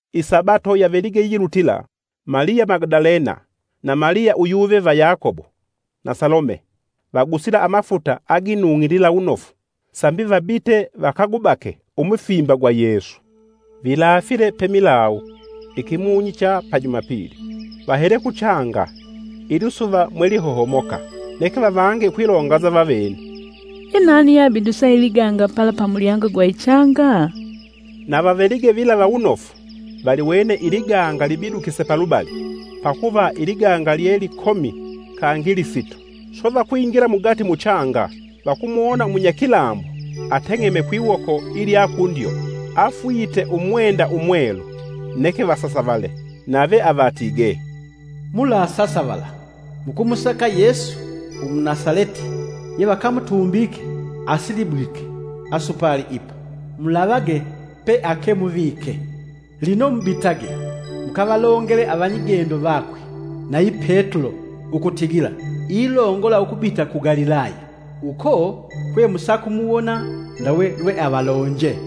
Isabato yavelige yilutila Maliya Magadalena na Maliya uyuve va Yakobo, na Salome vagusile amafuta aginung'ilila wunofu sambi vabite vakagubake umufimba gwa Yesu. Vilaafile wemilawu, ikimunyi cha pa Jumapili, vahele kuchanga, ilisuva mwelihohomoka. Neke vavange ukwilonganza vavene, “Ye nani yeabidusa iliganga pala pa mulyango gwa ichanga?” Na vavelige vilava wunofu, valiwene iliganga libidukise palubali. (pakuva iliganga lye likomi kangi lisito) Swe vakwingila mugati muchanga vakumuwona umunyakilambo ateng'eme kwiwoko ilya kundyo, afwite umwenda umwelu, neke vasasavale. Nave avatigee, “Mulasasavala. Mukumusaka Yesu Umunasaleti yevakamutumbike. Asilibwike asupali ipa. Mulavage peakemuvike. Lino mubitage, mukavalongele avanyigendo vakwe, nayi Petulo ukutigila, ilongola ukubita ku Galilaya. Uko kwe musakumuwona, ndawe lwealavalonje.”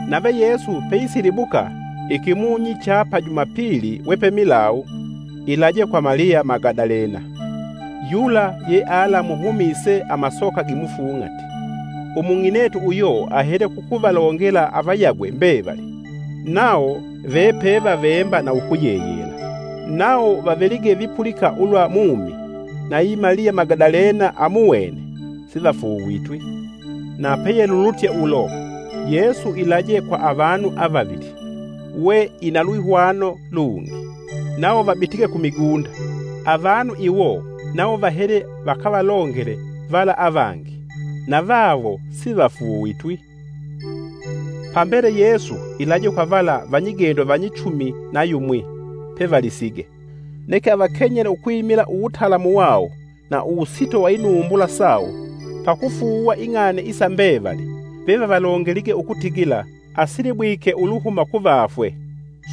Nave Yesu pe isilibuka, ikimunyi cha pa Jumapili, we pemilawu ilaje kwa Maliya Magadalena, yula yealamuhumise amasoka gimufung'ati. Umung'inetu uyo ahele kukuvalongela avayagwe mbevali, nawo vepevavemba na ukuyeyela. Nawo vavelige vipulika ulwa mumi, na yi Maliya Magadalena amuwene, sivafuuvitwi. Na peyelulutye ulo, Yesu ilaje ku avanu avavili, we ina lwihwano lungi. Nawo vabitige kumigunda. Avanu iwo nawo vahele vakavalongele vala avangi. Navawo sivafuuvitwi. Pambele Yesu ilaje kwa vala vanyigendo vanyichumi na yumwi pevalisige. Neke avakenyele ukwimila uwutalamu wawo na uwusito wa inumbula sawo pakufuuwa ing'ani isa mbevali vevavalongelige ukutigila asilibwike uluhuma kuvafwe.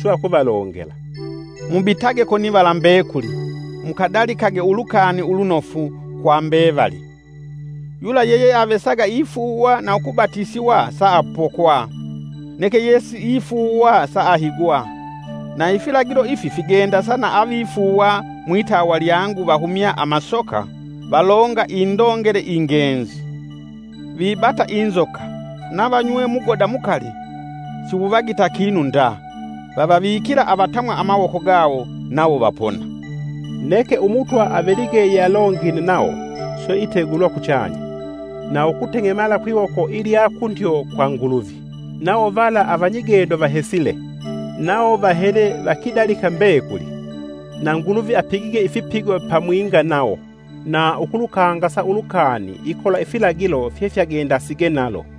Swe akuvalongela, “Mubitage konivala mbekuli, mukadalikage Ulukani Ulunofu kwa mbevali. Yula yeyeavesaga ifuuwa na ukubatisiwa saapokwa, neke yesiifuuwa saahigwa. Na ifilagilo ifi figendasa na avifuuwa: mwitawa lyangu vahumya amasoka, valonga indongele ingenzi. Vibata inzoka, na vanywe mugoda mukali siwuvagita kinu nda. Vavavikila avatamwa amawoko gawo nawo vapona.” Neke Umutwa avelige yalongine nawo, swe itegulwa kuchanya, na ukuteng'emala kwiwoko ilya kundyo kwa Nguluvi. Nawo vala avanyigendo vahesile, nawo vahele vakidalika mbekuli. Na Nguluvi apigige ifipigo pamwinga nawo, na ukusikangasa Ulukani ikola ifilagilo fyevagendasige nalo.]